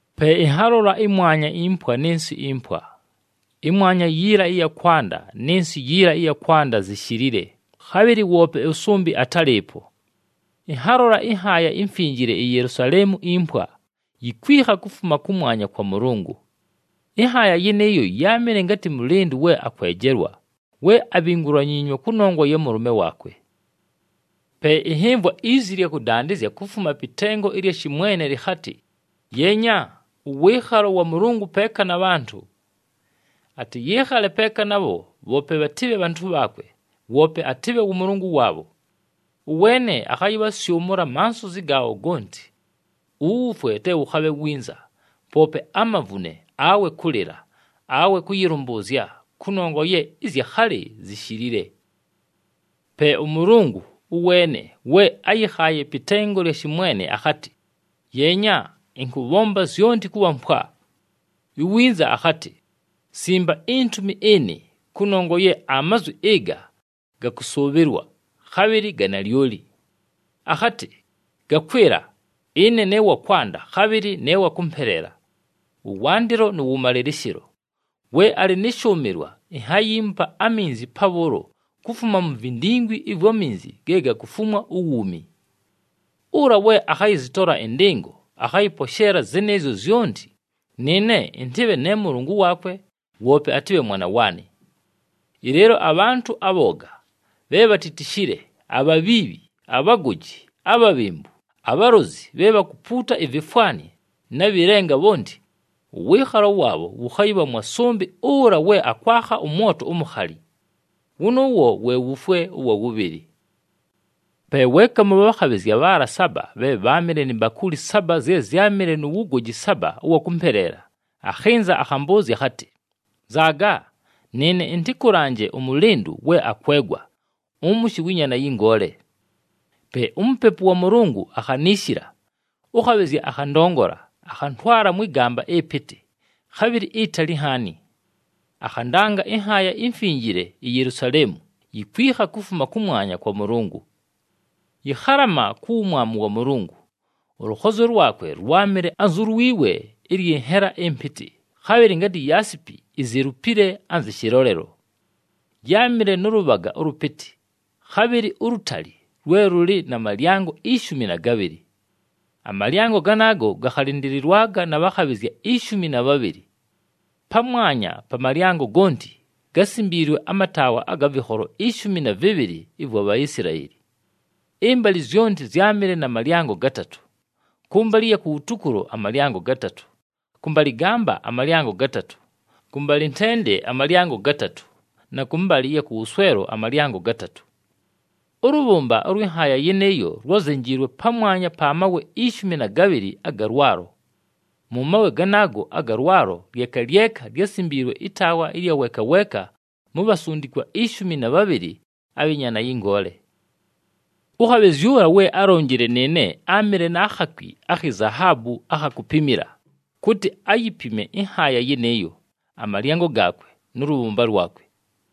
Pe ɨnhalola ɨmwanya impwa nɨ nsɨ impwa. Ɨmwanya yiila ɨya kwanda nɨ nsɨ yiila ɨya kwanda zishilile, khabhɨlɨ woope ʉsʉmbɨ atálɨɨpo. Ɨnhalola ɨnhaaya imfinjile, iYelusaleemu impwa, yikwikha kufuma kʉmwanya kwa Mʉlʉngʉ. Ɨnhaaya yɨnɨɨyo yáamɨle ngatɨ mʉlɨndʉ we akwejelwa, we abhingulanyiinywe kʉnongwa ya mʉlʉme waakwe. Pe ɨnhɨmvwa izi ɨlya kʉdandɨzya kufuma pɨ tengo ɨlya shɨmwene lɨkhatɨ, “Yeenya! Ʉwɨɨkhalo wa Mʉlʉngʉ peeka na bhantʉ. Atɨyɨɨkhale peeka nabho, bhoope bhatɨbhe bhantʉ bhaakwe, woope atɨbhe wʉ Mʉlʉngʉ waabho. Ʉweene akhayɨbhasyʉmʉla amansozi gaabho gonti. Uwufwe te wʉkhabhe winza, poope amavune, awe kʉlɨla, awe kʉyɨlʉmbʉʉzya, kʉnongwa ye ɨzya khalɨ zishilile!” Pe ʉMʉlʉngʉ, ʉweene we áyɨkhaaye pɨ tengo ɨlya shɨmwene akhatɨ, “Yeenya, ɨnkʉbhomba zyonti kʉbha mpwa.” Iwinza akhatɨ, “Simba intumi ɨnɨ, kʉnongwa ye amazwi ɨga ga kʉsʉʉbhɨlwa, khabhɨlɨ ga nalyoli!” Akhatɨ, “Gakwɨla! Ɨne ne wa kwanda, khabhɨlɨ ne wa kʉmpeleela, ʉwandɨlo nʉ wʉmalɨlɨshɨlo. We alɨ nɨ shʉʉmɨlwa, inhayiimupa aminzi pabhʉʉlo kufuma mu vindingwi ɨvwa minzi ge gakufumwa uwuumi. Ʉla we akhayɨzɨtola ɨndɨngo akhayɨposheela zɨnɨɨzyo zyonti, nɨɨne ɨntɨbhe ne Mʉlʉngʉ waakwe woope atɨbhe mwana waanɨ. Ɨleelo abhantʉ abhooga, bhe bhatitishile, abhabhiibhi, abhagoji, abhabhembu, abhalozi, bhe bhakupuuta ivifwani, na bhɨ lenga bhonti, ʉwɨɨkhalo waabho wʉkhayɨbha mwa sʉmbɨ ʉla we akwakha ʉmwoto umukhali. Wʉnʉʉwo we wufwe ʉwa wʉbhɨlɨ.” Pe weeka mʉ bhakhabhɨzya bhaala saba bhe bháamɨle ni mbakuuli saba zye zyámɨle nu wugoji saba ʉwa kʉmpeleela, akhɨnza akhambʉʉzya akhatɨ, “Nzaaga! Nɨɨne ɨntɨkʉlanje ʉmʉlɨndʉ we akwegwa, ʉmʉshɨ wɨ Nyaana yɨ Ngoole!” Pe uMupepu wa Mʉlʉngʉ akhaniishila, ʉkhabhɨzya akhandongola, akhantwala mwɨ gamba ɨpɨtɨ, khabhɨlɨ itali nhaani. Akhandanga ɨnhaaya imfinjile, iYelusaleemu, yikwikha kufuma kʉmwanya kwa Mʉlʉngʉ. Yɨkhalama ku wumwamu wa Mʉlʉngʉ. Ʉlʉkhozyo lwakwe lwámɨle anzu lwi we ɨlyɨ nhela ɨmpɨtɨ, khabhɨlɨ ngatɨ yaasipi izelupile anzɨ shɨlolelo. Yáamɨle nʉ lʉbhaga ʉlʉpɨtɨ, khabhɨlɨ ulutali lwe lʉlɨ na malyango ishumi na gabhɨlɨ. Amalyango ganaago gakhalɨndɨlɨlwaga na bhakhabhɨzya ishumi na bhabhɨlɨ. Pamwanya pa malyango gonti gásimbiilwe amataawa aga vɨkholo ishumi na vɨbhɨlɨ ɨvwa Bhaisilaeli. Ɨmbalɨ zyonti zyámɨle na malyango gatatʉ: kʉmbalɨ ɨya kuwutukulo amalyango gatatʉ, kʉmbalɨgamba amalyango gatatʉ, kʉmbalɨntende amalyango gatatʉ na kʉmbalɨ ɨya kʉwʉswelo amalyango gatatʉ. Ʉlʉbhʉmba ʉlwɨ nhaaya yɨnɨɨyo lwázenjiilwe pamwanya pa mawe ishumi na gabhɨlɨ aga lwalo. Mʉ mawe ganaago aga lwalo lyeka lyeka lyásimbiilwe ɨtaawa ɨlya weeka weeka mu bhasundikwa ishumi na bhabhɨlɨ abhɨ Nyaana yɨ Ngoole. Ʉkhabhɨzya ʉla we álonjile nɨɨne áamɨle na khakwi akhi zahaabu akha kupimila, kʉtɨ ayipime ɨnhaaya yɨnɨɨyo, amalyango gaakwe nʉ lʉbhʉmba lwakwe.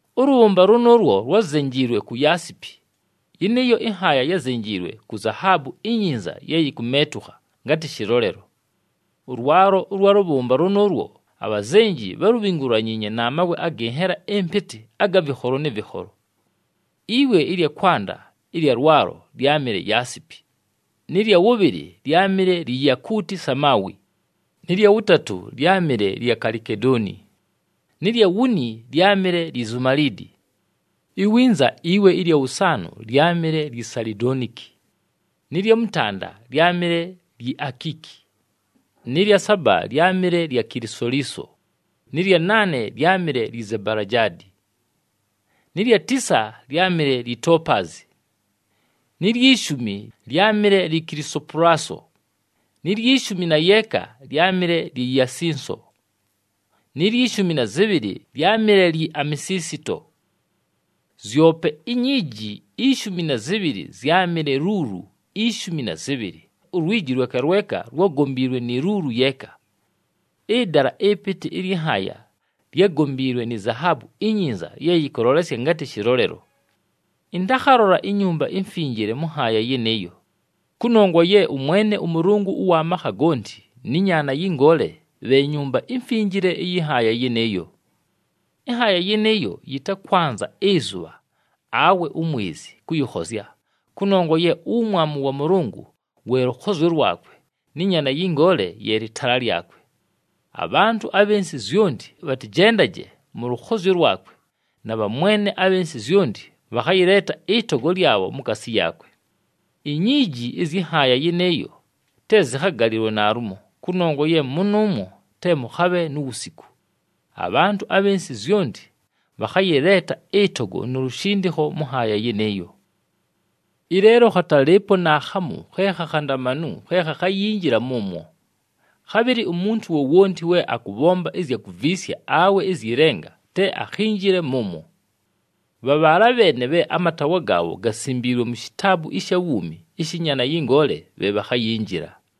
Ʉlʉbhʉmba lʉnʉʉlwo lwázenjiilwe ku yaasipi, yɨnɨɨyo ɨnhaaya yázenjiilwe ku zahaabu inyinza ye yikumeetukha ngatɨ shɨlolelo. Ʉlwalo ʉlwa lʉbhʉmba lʉnʉʉlwo abhazenji bhálubhingulanyiinye na mawe agɨ nhela ɨmpɨtɨ aga vɨkholo nɨ vɨkholo. Iwe ɨlya kwanda ɨlya lwalo lyámɨle yaasipi, nɨ lya wʉbhɨlɨ lyámɨle lyi yakuuti samaawi, nɨ lya wʉtatʉ lyámɨle lya kalikedooni, nɨ lya wuni lyámɨle lyi zumaliidi. Iwinza iwe ɨlya wʉsaanʉ lyámɨle lyi salidooniki, nɨ lya mʉtanda lyámɨle lyi akiiki, nɨ lya saba lyámɨle lya kilisoliiso, nɨ lya naane lyámɨle lyi zabalajaadi, nɨ lya tisa lyámɨle lyi topaazi, ni lyi shumi lyámɨle lyi kilisopulaso, ni lyi shumi na yeeka lyámɨle lyi yasinso, ni lyi shumi na zɨbhɨlɨ lyámɨle lyi amesiisito. Zyope inyiiji ishumi na zɨbhɨlɨ zyámɨle luulu ishumi na zɨbhɨlɨ, ulwiji lweka lweka lwágombiilwe ni luulu yeeka. Ɨdala ɨpɨtɨ ɨlyɨ nhaaya lyágombiilwe ni zahaabu inyinza ye yɨkʉlolesya ngatɨ shɨlolelo. Ɨntakhalola iNyumba iMfinjile mʉ nhaaya yɨnɨɨyo, kʉnongwa ye ʉMwene ʉMʉlʉngʉ ʉwa makha gonti nɨ Nyaana yɨ Ngoole bhe Nyumba iMfinjile ɨyɨ nhaaya yɨnɨɨyo. Ɨnhaaya yɨnɨɨyo yɨtakwanza ɨzʉbha awe umwezi kʉyɨkhozya, kʉnongwa ye uwumwamu wa Mʉlʉngʉ we lʉkhozyo lwakwe, nɨ Nyaana yɨ Ngoole ye lɨtaala lyakwe. Abhantʉ abhɨ nsɨ zyonti bhatɨjendaje mʉ lʉkhozyo lwakwe na bhamwene abhɨ nsɨ zyonti bhakhayɨleeta ɨtogo lyabho mukaasi yaakwe. Inyiiji ɨzyɨ nhaaya yɨnɨɨyo te zɨkhagalɨlwe naalumo, kʉnongwa ye mʉnʉʉmwo te mʉkhabhe nu wusiku. Abhantʉ abhɨ nsɨ zyonti bhakhayɨleeta ɨtogo nu lushindikho mʉ nhaaya yɨnɨɨyo. Ɨleelo khatalɨɨpo naakhamu khe khakhandamanu khe khakhayinjila mʉmwo. Khabhɨlɨ umuntu wowonti we akʉbhomba ɨzya kuviisya awe ɨzyɨ lenga te akhinjile mʉmwo. Bha bhaala bheene bhe amataawa gaabho gasimbiilwe mu shitaabu ɨsha wuumi ɨshɨ Nyaana yɨ Ngoole bhe bhakhayinjila.